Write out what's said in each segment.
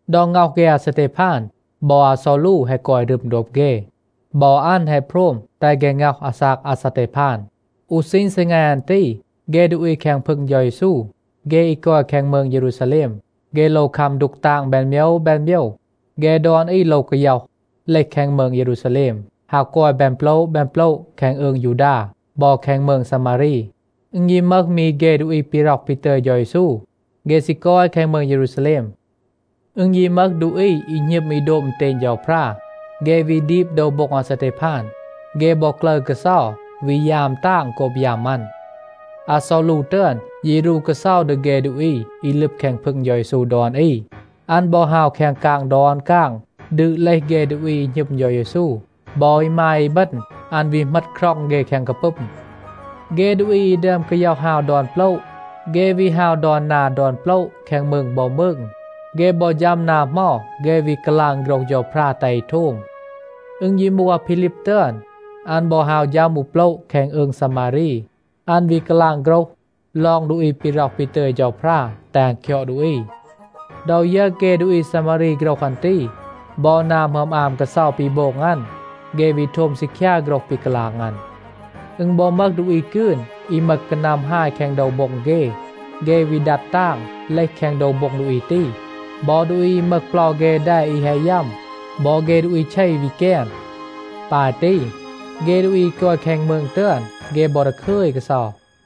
ดอ ง็อห เฆ อาซาเทพาน บอ อาซอลู แฮะ กอย รึม โดบ เฆ. บอ อัน แฮะ โพรม แตห เฆ ง็อห อาซาก อาซาเทพาน. อู ซีณ ซีแง อัน ตี, เฆ ดูอี แคง พึง เฌา เยซู, เฆ อี กอย แคง มืง เยรูซาแลม, เฆ โลว คัม ดูก ตาง แบน โมยว แบน โมยว. เฆ ดอน อี โลว กาย็อห, เลห แคง มืง เยรูซาแลม, ฮาว กอย แบน โปละ แบน โปละ แคง อืง ยูดา บอ แคง มืง ซามารี. อึณ ยี มึห มี เฆ ดูอี ปี ร็อห ปี ตึย เฌา เยซู, เฆ ซี กอย แคง มืง เยรูซาแลม. อึณ ยี มึห ดูอี อี หณึม อี โดบ อึณเตณ เฌาพรา, เฆ วี ดีบ โดว โบ็ง อาซาเทพาน. เฆ บอ กลึร กาเซา, วี ยาม ตาง โกบ ยัม อัน. อาซอลู ตึอน ยี รู กาเซา ดี เฆ ดูอี อี ลึบ แคง พึง เฌา เยซู ดอน อี. อัน บอ ฮาว แคง กาง ดอน กาง, ดืด เลห เฆ ดูอี อี หณึม เฌา เยซู, บอ อีมาย อีบึณ. อัน วี เหมต คร็อง เฆ แคง กาปึม. เฆ ดูอี อี ดึอม กาย็อห ฮาว ดอน โปละ, เฆ วี ฮาว ดอน นา ดอน โปละ แคง มืง บอ มืง. เฆ บอ ฌัม นา เหมา, เฆ วี กาลาง โฆรห เฌาพรา แตห อี โทม. อึณ ยี มูห อาพีลีบ ตึอน, อัน บอ ฮาว ฌัม อู โปละ แคง อืง ซามารี. อัน วี กาลาง โฆรห ลอง ดูอี ปี ร็อห ปี ตึย เฌาพรา แตห อัน คยอด ดูอี. ดอ ยึร เฆ ดูอี ซามารี โฆรห อัน ตี บอ นา หมึอม อาม กาเซา ปี โบง อัน, เฆ วี โทม ซีคยา โฆรห ปี กาลาง อัน. อึณ บอ มึห ดูอี กืน, อี มึห กานัม ฮาย กอย แคง โดว โบ็ง เฆ, เฆ วี ดัด ตาง, เลห แคง โดว โบ็ง ดูอี ตี. บอ ดูอี อี มึห เปลา เฆ แด อี แฮะ ยัม, บอ เฆ ดูอี เช วี แกน. ปาย ตี, เฆ ดูอี อี กอย แคง มืง ตึอน, เฆ บอ ดาคึย กาเซา.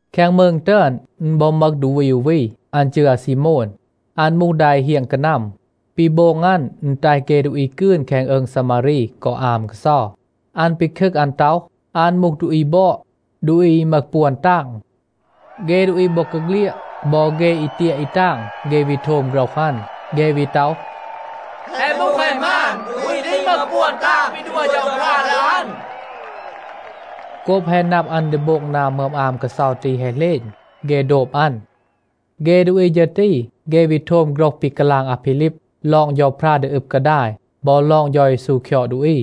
แคง มืง ตึอน, อึณ บอ มึห ดูอี อู วี, อัน จืร อาซีโมน. อัน มูห ดา อี เฮียง กานัม. ปี โบง อัน, อึณ แตห เฆ ดูอี กืน แคง อืง ซามารี กอ อาม กาเซา. อัน ปีคึก อัน ต็อห, อัน มูห ดูอี บอด, ดูอี อี มึห ปวน ตาง. เฆ ดูอี บอกาเฆลียด, บอ เฆ อี เตียะ อี ตาง, เฆ วี โทม โฆรห อัน. เฆ วี ต็อห, “แฮะ มูห แฮะ หมาน, ดูอี ตี มึห ปวน ตาง ปี ดัว เฌาพรา ดี อัน.” โกบ แฮะ นับ อัน ดี โบง นา หมึอม อาม กาเซา ตี แฮะ เหลณ, เฆ โดบ อัน. เฆ ดูอี ฌึร ตี, เฆ วี โทม โฆรห ปี กาลาง อาพีลีบ ลอง เฌาพรา ดี อึบ กาดาย บอ ลอง เฌา เยซู คยอด ดูอี.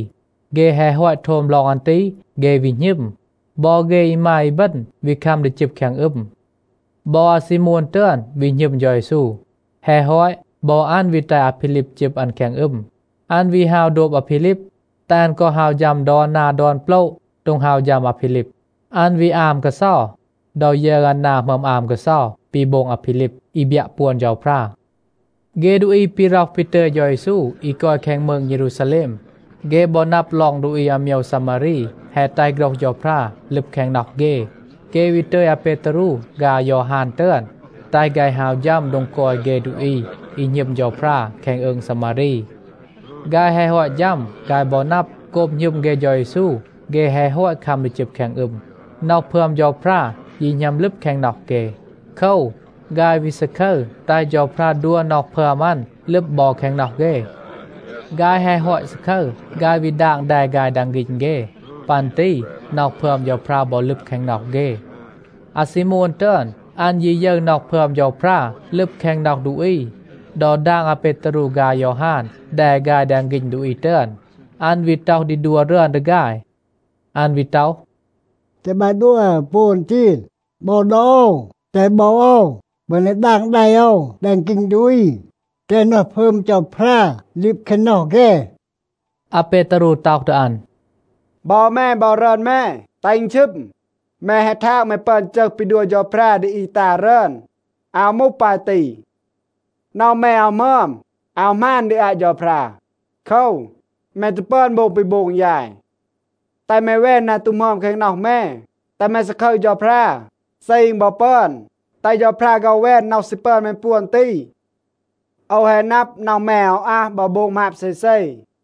เฆ แฮะ ฮอต โทม ลอง อัน ตี, เฆ วี หณึม. บอ เฆ อีมาย อีบึณ วี คัม ดี จึบ แคง อึม. บอ อาซีโมน ตึอน วี หณึม เฌา เยซู. แฮะ ฮอต, บอ อัน วี แตห อาพีลีบ จึบ อัน แคง อึม. อัน วี ฮาว โดบ อาพีลีบ, แตห อัน กอ ฮาว ฌัม ดอน นา ดอน โปละ โดง ฮาว ฌัม อาพีลีบ. อัน วี อาม กาเซา ดอ ยึร อัน นา หมึอม อาม กาเซา ปี โบง อาพีลีบ, อี บยัะ ปวน เฌาพรา. เฆ ดูอี ปี ร็อห ปี ตึย เฌา เยซู อี กอย แคง มืง เยรูซาแลม, เฆ บอ นับ ลอง ดูอี อาโมยว ซามารี แฮะ แตห โฆรห เฌาพรา ลึบ แคง น็อห เฆ, เฆ วี ตึย อาเปตารู ฆาย อายอฮาน ตึอน, แตห ฆาย ฮาว ฌัม โดง กอย เฆ ดูอี อี หณึม เฌาพรา แคง อืง ซามารี. ฆาย แฮะ ฮอต ฌัม, ฆาย บอ นับ, โกบ หณึม เฆ เฌา เยซู, เฆ แฮะ ฮอต คัม ดี จึบ แคง อึม. น็อห พึอม เฌาพรา ยี หณัม ลึบ แคง น็อห เฆ. โคว, ฆาย วี ซาคึร แตห เฌาพรา ดัว น็อห พึอม อัน ลึบ บอ แคง น็อห เฆ. ฆาย แฮะ ฮอต ซาคึร, ฆาย วี ดาง แด ฆาย แดง ฆีณ เฆ. ปัน ตี น็อห พึอม เฌาพรา บอ ลึบ แคง น็อห เฆ. อาซีโมน ตึอน, อัน ยี ยึร น็อห พึอม เฌาพรา ลึบ แคง น็อห ดูอี ดอ ดาง อาเปตารู ฆาย อายอฮาน แด ฆาย แดง ฆีณ ดูอี ตึอน, อัน วี ต็อห ดี ดัว รึอน ดี ฆาย. อัน วี ต็อห, “แตห บาย ดัว ปวน ตี บอ ดี โอว. แตห บอ โอว ปึอน ดี ดาง แด โอว แดง ฆีณ ดูอี, แตห น็อห พึอม เฌาพรา ลึบ แคง น็อห เฆ.” อาเปตารู ต็อห ดี อัน, “บอ แม บอ รึอน แม, แตห อึณ ชึม. แม แฮะ ทาง แม ปึอน จึห ปี ดัว เฌาพรา ดี อี ตา รึอน. อาว มูห ปาย ตี. น็อห แม อาว หมึอม, อาว หมาน ดี อาต เฌาพรา. โคว, แม ตู ปึอน โบง ปี โบง ยาย. แตห แม แวน นา ตู หมึอม แคง น็อห แม, แตห แม ซาคึร เฌาพรา. เซ อึณ บอ ปึอน, แตห เฌาพรา ฆ็อห แวน น็อห ซี ปึอน แม ปวน ตี. โอว แฮะ นับ, น็อห แม อาว อัห บอ โบง หมาบ เซเซ.”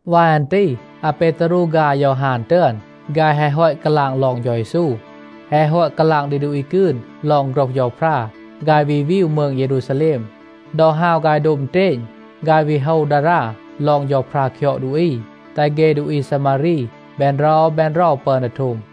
วาย อัน ตี อาเปตารู ฆาย อายอฮาน ตึอน, ฆาย แฮะ ฮอต กาลาง ลอง เฌา เยซู, แฮะ ฮอต กาลาง ดี ดูอี กืน ลอง โฆรห เฌาพรา, ฆาย วี วีว มืง เยรูซาแลม. ดอ ฮาว ฆาย โดบ อึณเตณ, ฆาย วี โฮว ดารา ลอง เฌาพรา คยอด ดูอี, แตห เฆ ดูอี ซามารี แบน เรา แบน เรา ปึอน ดี โทม.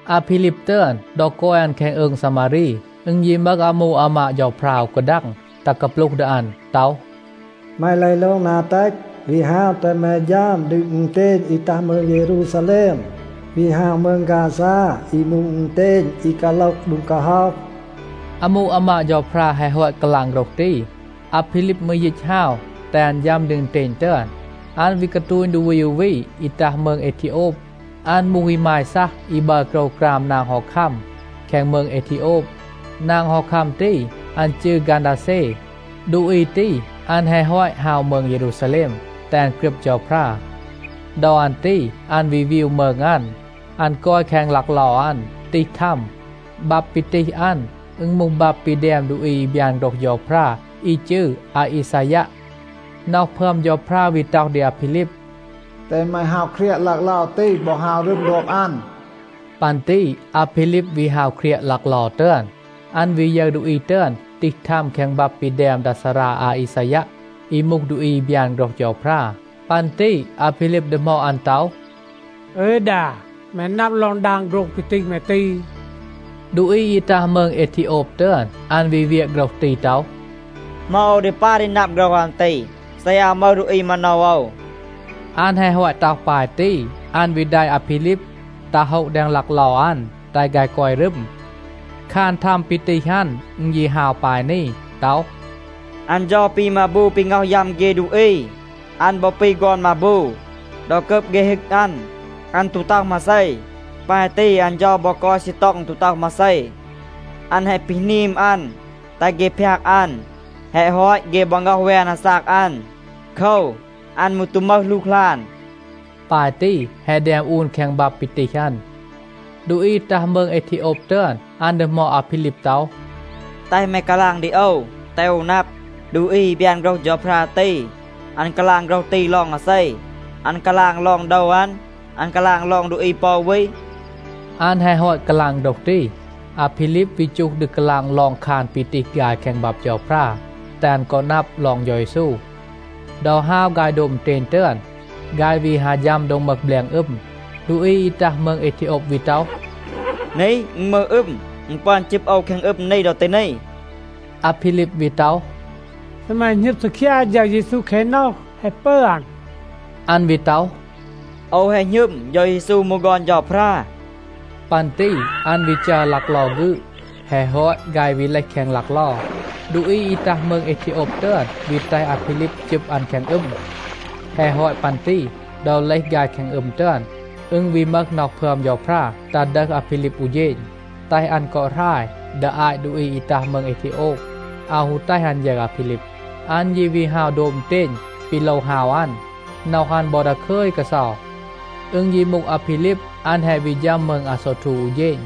อาพีลีบ ตึอน, ดอ กอย อัน แคง อืง ซามารี, อึณ ยี มึห อามู อามาด เฌาพรา อู กาดัง ตัห กาปลูห ดี อัน ต็อห, “แม เลห โลง นา เตต, วี ฮาว แตห แม ฌัม ดี อึณเตณ อี ตัห มืง เยรูซาแลม, วี ฮาว มืง ฆาซา อี มูห อึณเตณ อี กาโลห โดง กาฮ็อห.” อามู อามาด เฌาพรา แฮะ ฮอต กาลาง โฆรห ตี, อาพีลีบ มืร ยีต ฮาว แตห อัน ฌัม ดี อึณเตณ ตึอน. อัน วี กาตูณ ดูอี อู วี อี ตัห มืง เอทีโอบ. อัน มูห อีมาย ซัห อี บัร โกรวกราม นาง ฮอคัม แคง มืง เอทีโอบ. นาง ฮอคัม ตี, อัน จืร กันดาเซ. ดูอี ตี, อัน แฮะ ฮอต ฮาว มืง เยรูซาแลม, แตห อัน กรึบ เฌาพรา. ดอ อัน ตี อัน วี วีว มืง อัน. อัน กอย แคง ลักเลา อัน, ตีห ทัม. บับ ปี ตีห อัน, อึณ มูห บับ ปี แดม ดูอี อี บยาน โฆรห เฌาพรา อี จืร อาอีซายัะ. น็อห พึอม เฌาพรา วี ต็อห ดี อาพีลีบ, “แตห แม ฮาว เครียะ ลักเลา ตี บอ ฮาว รึม โดบ อัน.” ปัน ตี อาพีลีบ วี ฮาว เครียะ ลักเลา ตึอน. อัน วี ยึร ดูอี ตึอน ตีห ทัม แคง บับ ปี แดม ดา ซารา อาอีซายัะ, อี มูห ดูอี อี บยาน โฆรห เฌาพรา. ปัน ตี อาพีลีบ ดีหมอด อัน ต็อห, “อึย ดา, แม นับ ลอง ดาง โฆรห ปี ตีห แม ตี?” ดูอี อี ตัห มืง เอทีโอบ ตึอน, อัน วี เวียะ โฆรห ตี ต็อห, “เหมา โอว ดี ปาย ดี นับ โฆรห อัน ตี, เซ อาว มึห ดูอี มาโนว โอว?” อัน แฮะ ฮอต ต็อห ปาย ตี, อัน วี แดะ อาพีลีบ ตัห โฮะ แดง ลักเลา อัน, แตห ฆาย กอย รึม. คาน ทัม ปี ตีห อัน, อึณ ยี ฮาว ปาย นี ต็อห, “อัน เฌา ปี มาบู ปี ง็อห ยัม เฆ ดูอี. อัน บอ ปี ฆอน มาบู. ดอ กับ เฆ ฮึก อัน, อัน ตู ต็อห มาเซ. ปาย ตี อัน เฌา บอ กอย ซีต็อง ตู ต็อห มาเซ, อัน แฮะ ปีหนีม อัน, แตห เฆ พยาก อัน. แฮะ ฮอต, เฆ บอ ง็อห แวน อาซาก อัน. โคว, อัน มืร ตู มึห หลูกหลาน.” ปาย ตี แฮะ แดม อูน แคง บับ ปี ตีห อัน. ดูอี ตัห มืง เอทีโอบ ตึอน, อัน ดีหมอด อาพีลีบ ต็อห, “แตห แม กาลาง ดี โอว, แตห โอว นับ. ดูอี อี บยาน โฆรห เฌาพรา ตี, อัน กาลาง โฆรห ตี ลอง อาเซ? อัน กาลาง ลอง โดว อัน, อัน กาลาง ลอง ดูอี ปอ อู วี?” อัน แฮะ ฮอต กาลาง โฆรห ตี, อาพีลีบ วี จูห ดี กาลาง ลอง คาน ปี ตีห ฆาย แคง บับ เฌาพรา, แตห อัน กอ นับ ลอง เฌา เยซู. ดอ ฮาว ฆาย โดบ อึณเตณ ตึอน, ฆาย วี ฮา ฌัม โดง มึห แบลง อึม. ดูอี อี ตัห มืง เอทีโอบ วี ต็อห, “นี, อึณ มึห อึม. อึณ ปึอน จึบ โอว แคง อึม นี ดอ ตี นี?” อาพีลีบ วี ต็อห, “เซ แม หณึม ซีคยา เฌา เยซู แคง น็อห, แฮะ ปึอน.” อัน วี ต็อห, “โอว แฮะ หณึม, เฌา เยซู มูห ฆอน เฌาพรา.” ปัน ตี อัน วี จัร ลักเลา ฆืด. แฮะ ฮอต, ฆาย วี เลห แคง ลักเลา. ดูอี อี ตัห มืง เอทีโอบ ตึอน วี แตห อาพีลีบ จึบ อัน แคง อึม. แฮะ ฮอต ปัน ตี ดอ เลห ฆาย แคง อึม ตึอน, อึณ วี มึห น็อห พึอม เฌาพรา ตัห ดึห อาพีลีบ อู เฌณ, แตห อัน กอ หราย ดี อาต ดูอี อี ตัห มืง เอทีโอบ, อาว ฮู แตห อัน ยึร อาพีลีบ. อัน ยี วี ฮาว โดบ อึณเตณ ปี โลว ฮาว อัน. น็อห อัน บอ ดาคึย กาเซา. อึณ ยี มูห อาพีลีบ, อัน แฮะ วี ฌัม มืง อาโซวทู อู เฌณ.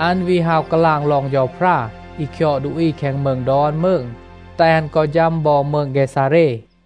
อัน วี ฮาว กาลาง ลอง เฌาพรา อี คยอด ดูอี แคง มืง ดอน มืง, แตห อัน กอ ฌัม บอ มืง เกซาเร.